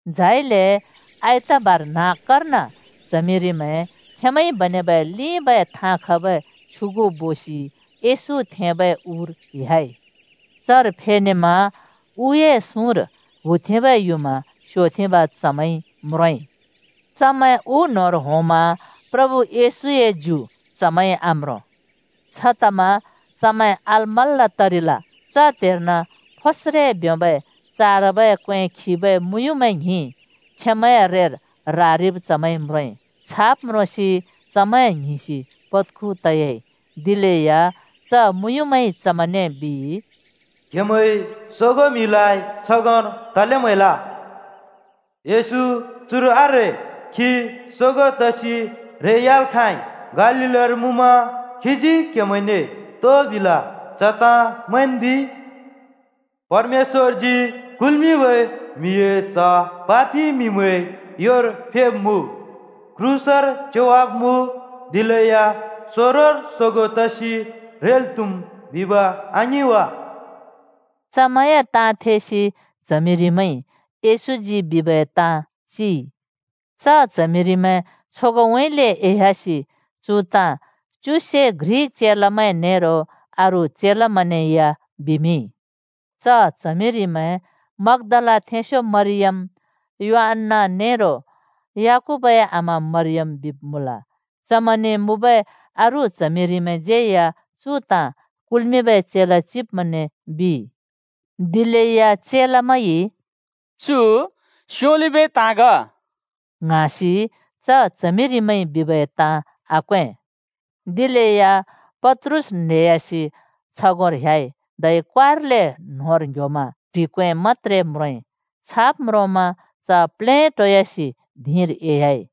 झाइले आइतबार न्‍हाँक्‍कर्न च्हमिरिमैं खेंमैंइ बनेबै लिंबै थाँ खबै छ्युगु बोसि येशू थेंबै उर ह्‍याइ। चर फेनेमा उए सुँर हुथेंबै युँमा स्‍योथेंब चमैंइ म्रोंइ। चमैं उ न्‍होंर होंमा प्रभु येशूए सिनुआम्रों। छतमा चमैं अलमल्‍ल तरिल। च त्‍हेर्न फोस्रे ब्योंबै चारबै क्‍वें खिबै मुँयुँमैं ङ्हिं खेंमैंए रेर रारिब् चमैंइ म्रोंइ। छाब् म्रोंसि चमैं ङ्हिंसि पत्‍खु तयाइ। दिलेया च मुँयुँमैंइ चमैंने बिइ, “क्‍हेमैंइ सोगों म्हिलाइ छगोंर तले म्‍हैल? येशू चुर आरे, खी सोगों तसि रेह्‍याल् खाँइ। गालीलर मुँमा खीजी क्‍हेमैंने तो बिल च ताँ मैंन्दि। ‘परमेश्‍वरजी कुल्‍मिंबै म्‍हिए च्ह पापि म्‍हिमैंए योर फेब्मुँ, क्रूसर च्‍योवाब्मुँ। दिलेया सोंरोर सोगों तसि रेल् त्‍हुम्,’ बिब आङिं वा?” चमैंए ताँ थेसि च्हमिरिमैंइ येशूजी बिबै ताँ चिइ। च च्हमिरिमैं छगोंउँइँले एह्‍यासि चु ताँ च्युसे घ्रि चेलामैं नेरो अरू चेलामैंने या बिमिंइ। च च्हमिरिमैं मग्‍दलाथेंस्‍यो मरियम, योअन्‍ना नेरो याकूबए आमा मरियम बिब् मुँल। चमैंने मुँबै अरू च्हमिरिमैंज्यै या चु ताँ कुल्मिंबै चेला चिब्मैंने बिइ। दिलेया चेलामैंइ “चु स्योलिबै ताँ ग” ङ्हाँसि च च्हमिरिमैंइ बिबै ताँ आक्‍वें। दिलेया पत्रुस रेसि छगोंर न्हेह्‍याइ, धै क्वारले न्‍होंर ङ्ह्‍योमा ट्हि क्‍वें मत्‍त्रे म्रोंइ। छाब् म्रोंमा च प्लेटोयासि धिंर एह्‍याइ।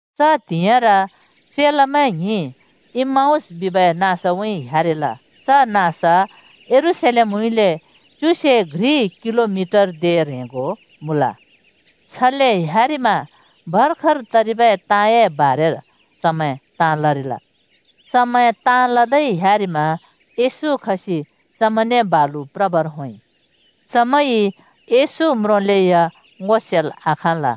च त्हिंइर्न चेलामैं ङ्हिं इम्‍माउस बिबै नाँसउँइँ ह्‍यारिल। च नाँस यरूशलेमउँइँले च्युसे घ्रि किलोमेटर ह्रेंगो मुँल। छले ह्‍यारिमा भर्खर तरिबै ताँए बारेर चमैं ताँ लरिल। चमैं ताँ लदै ह्‍यारिमा येशू खसि चमैंने बालु प्रबर होंइ। चमैंइ येशू म्रोंलेया ङो सेल् आखाँल।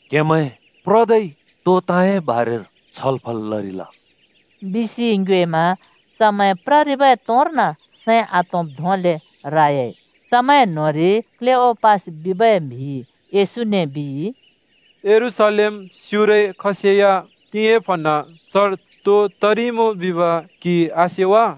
“क्‍हेमैं प्रदै तो ताँए बारेर छलफल लरिल?” बिसि येशूजी चमैंने ङ्योएमा चमैं प्ररिबै तोंर्न सैं आतोंब् धोंले रायइ। चमैं न्‍होंरि क्‍लेओपास बिबै म्‍हिइ येशूने बिइ, “यरूशलेम स्युरै खसेया तिंयाँ प्हँनाँ चर तो तरिइमुँ बिब क्हिइ आसे वा?”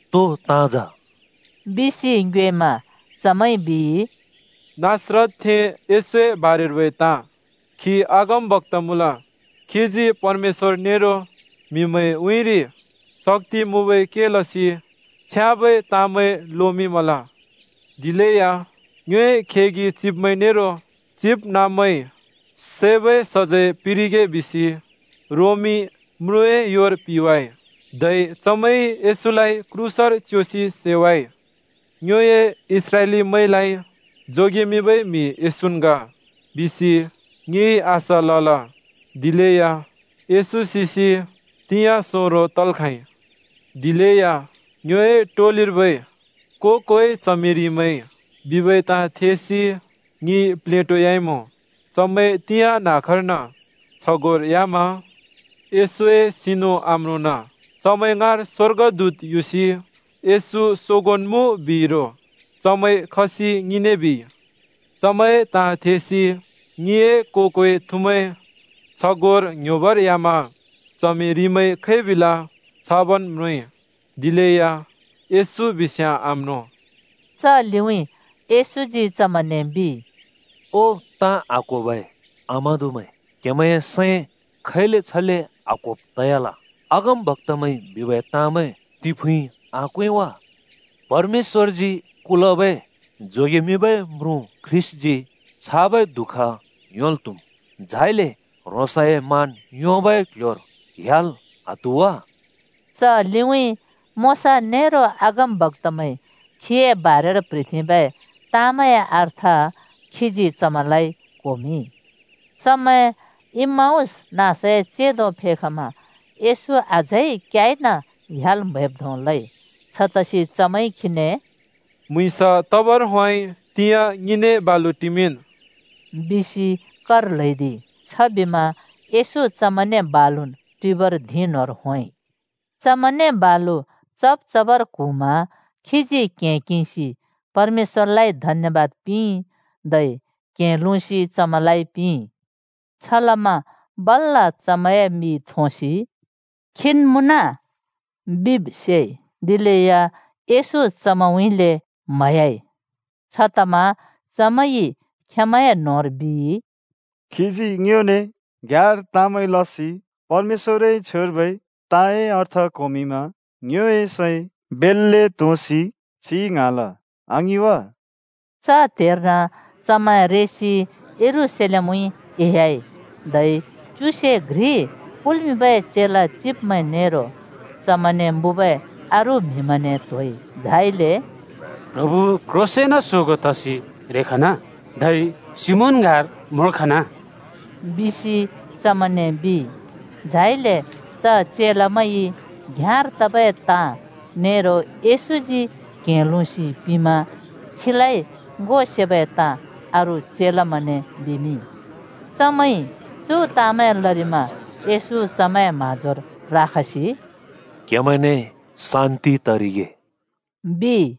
“तो ताँ जा?” बिसि येशूजी चमैंने ङ्योएमा चमैंइ बिइ, “नासरतथें येशूए बारेर्बै ताँ खी अगमबक्‍ता मुँल, खीजी परमेश्‍वर नेरो म्हिमैंए उँइँरि शक्‍ति मुँबै के लसि छ्याँबै ताँमैं लोमिंमल। दिलेया ङ्योए खेगि चिब्मैं नेरो चिबनाँब्मैंइ सैबै सजैं पिंरिगे बिसि रोमी म्रुँए योर पिंवाइ। धै चमैंइ येशूलाइ क्रूसर च्‍योसि सैवाइ। ‘ङ्योए इस्राएलीमैंलाइ जोगेमिंबै म्‍हि येशून् ग,’ बिसि ङिइ आशा लल। दिलेया येशू सिसि तिंयाँ सोंरो तल् खाँइ। दिलेया ङिए टोलिर्बै को-कोइ च्हमिरिमैंइ बिबै ताँ थेसि ङि प्लेटोयाइमुँ। चमैं तिंयाँ न्हाँक्‍कर्न छगोंर ह्‍यामा येशूए सिनु आम्रोंना। चमैं ङाँर स्‍वर्गदूत युसि येशू सोगोंन् मुँ बिइ रो। चमैं खसि ङिने बिइ। चमैंए ताँ थेसि ङिए को-कोइ थुमैं छगोंर ङ्ह्‍योबर ह्‍यामा च्हमिरिमैंइ खै बिल छाबन् म्रोंइ। दिलेया येशू बिस्याँ आम्रों।” च लिउँइँ येशूजी चमैंने बिइ, “ओ, ताँ आक्होबै आम्हादुमैं! क्हेमैंए सैं खैले छले आक्होब् तयाल? अगमबक्‍तामैंइ बिबै ताँमैं तिफुँइ आक्वें वा! परमेश्‍वरजी कुल्मिंबै जोगेमिंबै म्रुँ ख्रीष्‍टजी छाबै दुःख योंल् त्‍हुम्। झाइले ह्रोंसए मान योंबै कल्ह्‍योर ह्‍याल् आत्हु वा?” च लिउँइँ मोशा नेरो अगमबक्‍तामैंइ खीए बारेर प्‍ह्रिथेंबै ताँमैंए अर्थ खीजी चमैंलाइ क्होमिंइ। चमैं इम्‍माउस नाँसए चेंदो फेखमा येशू अझै क्याइन ह्‍याल् म्हैब् धों लइ। छतसि “म्‍हुँइँस तबर होंइ। तिंयाँ ङिने बालुन् टिमिंन्!” बिसि चमैंइ खीने कर ल्हैदिइ। छबिमा येशू चमैंने बालुन् टिबर धिं न्होंर होंइ। चमैंने बालु चब् चबर क्हुँमा खीजी क्‍हें किंसि परमेश्‍वरलाइ धन्यबाद पिंइ, धै क्‍हें लुँसि चमैंलाइ पिंइ। छलमा बल्‍ल चमैंए मि थोंसि “खीन् मुँन!” बिब् सेइ। दिलेया येशू चमैंउँइँले म्हयाइ। छतमा चमैंइ खेंमैंए न्होंर बिइ, “खीजी ङ्योने घ्‍याँर ताँमैं लसि परमेश्‍वरए छ्वेर्बै ताँए अर्थ क्होमिंमा ङ्योए सैं बेल्‍ले तोंसि छिं ङ्हाँल, आङिं वा?” च त्हेर्न चमैं रेसि यरूशलेमउँइँ एह्‍याइ। धै च्युसे घ्रि कुल्मिंबै चेला चिब्मैं नेरो चमैंने मुँबै अरू म्हिमैंने त्‍होइ। झाइले “प्रभु येशू क्‍ह्रोंसेंन सोगों तसि रेखना! धै सिमोन ङाँर म्रोंखन!” बिसि चमैंने बिइ। झाइले च चेलामैंइ घ्‍याँर तबै ताँ नेरो येशूजी क्‍हें लुँसि पिंमा खीलाइ ङो सेबै ताँ अरू चेलामैंने बिमिंइ। चमैंइ चु ताँमैं लरिमा येशू चमैंए म्‍हाँजोर राखसि “क्‍हेमैंने शान्‍ति तरिगे,” बिइ।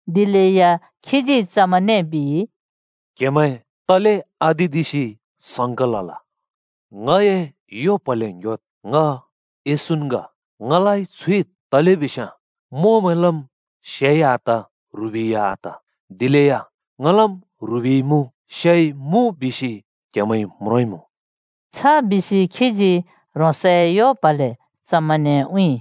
दिलेया खीजी चमैंने बिइ, “क्‍हेमैं तले आदिदिसि संका लल? ङए यो प्‍हले ङ्ह्‍योद्! ङ येशून् ग, ङलाइ छुइद्। तलेबिस्याँ मोंमैंलम् से आत, ह्रिबै या आत। दिलेया ङलम् ह्रिबै मुँ से या मुँ बिसि क्हेंमैइ म्रोंइमुँ।” छ बिसि खीजी ह्रोंसए यो प्‍हले चमैंने उँउँइ।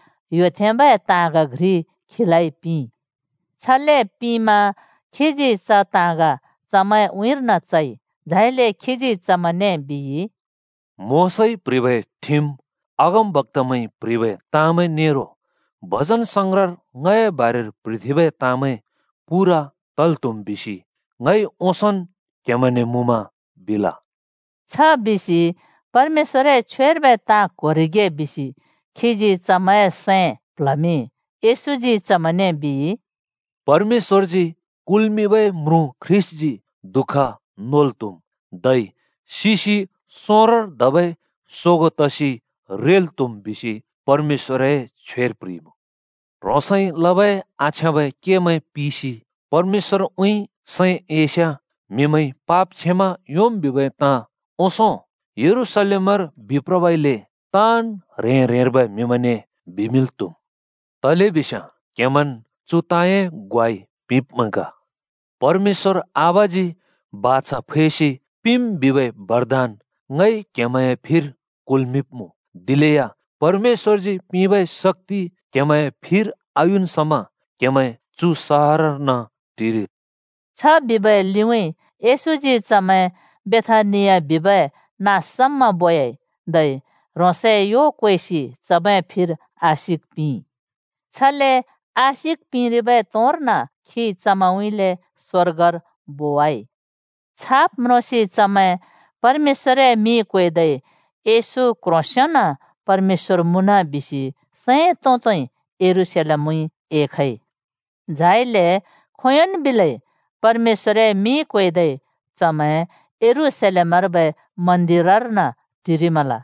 छबिमा चमैंइ तेबै ताँग घ्रि खीलाइ पिंइ। छले पिंमा खीजी च ताँग चमैंए उँइँर्न चइ। झाइले खीजी चमैंने बिइ, “मोशाइ प्‍ह्रिबै ठिम, अगमबक्‍तामैंइ प्‍ह्रिबै ताँमैं नेरो भजनसंग्रहर ङए बारेर प्‍ह्रिथेंबै ताँमैं पूरा तल् त्‍हुम् बिसि ङइ ओंसोंन् क्‍हेमैंने मुँमा बिल।” छ बिसि परमेश्‍वरए छ्वेर्बै ताँ क्‍होरिगे बिसि खीजी चमैंए सैं प्ल्हमिंइ। येशूजी चमैंने बिइ, “‘परमेश्‍वरजी कुल्मिंबै म्रुँ ख्रीष्‍टजी दुःख नोल् त्‍हुम्, धै सिसि सोंरोर धबै सोगों तसि रेल् त्‍हुम्,’ बिसि परमेश्‍वरए छ्वेर प्‍ह्रिइमुँ। ह्रोंसइ लबै आछ्याँबै केमैं पिसि परमेश्‍वरउँइँ सैं एइस्याँ म्हिमैंइ पाप क्षमा योंम् बिबै ताँ ओंसों यरूशलेमर बिप्रबइले ताँन् ह्रें-ह्रेंर्बै म्हिमैंने बिमिंल् त्हुम्। तलेबिस्याँ क्‍हेमैंन् चु ताँए ग्वाइ पिंब्मैं ग। परमेश्‍वर आबाजी बाछा फैसि पिंम् बिबै बरदान ङइ क्हेमैंए फिर कुल्मिंब्मुँ। दिलेया परमेश्‍वरजी पिंबै शक्‍ति क्हेमैंए फिर आयुन् समा क्हेमैं चु सहरर्न टिरिद्।” छ बिबै लिउँइँ येशूजी चमैं बेथानिया बिबै नाँस समा बोयाइ, धै ह्रोंसए यो क्वेसि चमैंए फिर आशिक पिंइ। छले आशिक पिंरिबै तोंर्न खी चमैंउँइँले स्वर्गर बोवाइ। छाब् म्रोंसि चमैं परमेश्‍वर‍ए मिं क्वेदै येशू क्ह्रोंसेंन परमेश्‍वर मुँन बिसि सैं तों-तोंइ यरूशलेमउँइँ एखइ। झाइले खोंयोंन् बिलै परमेश्‍वए मिं क्वेदै चमैं यरूशलेमर्बै मन्दिरर्न टिरिमल।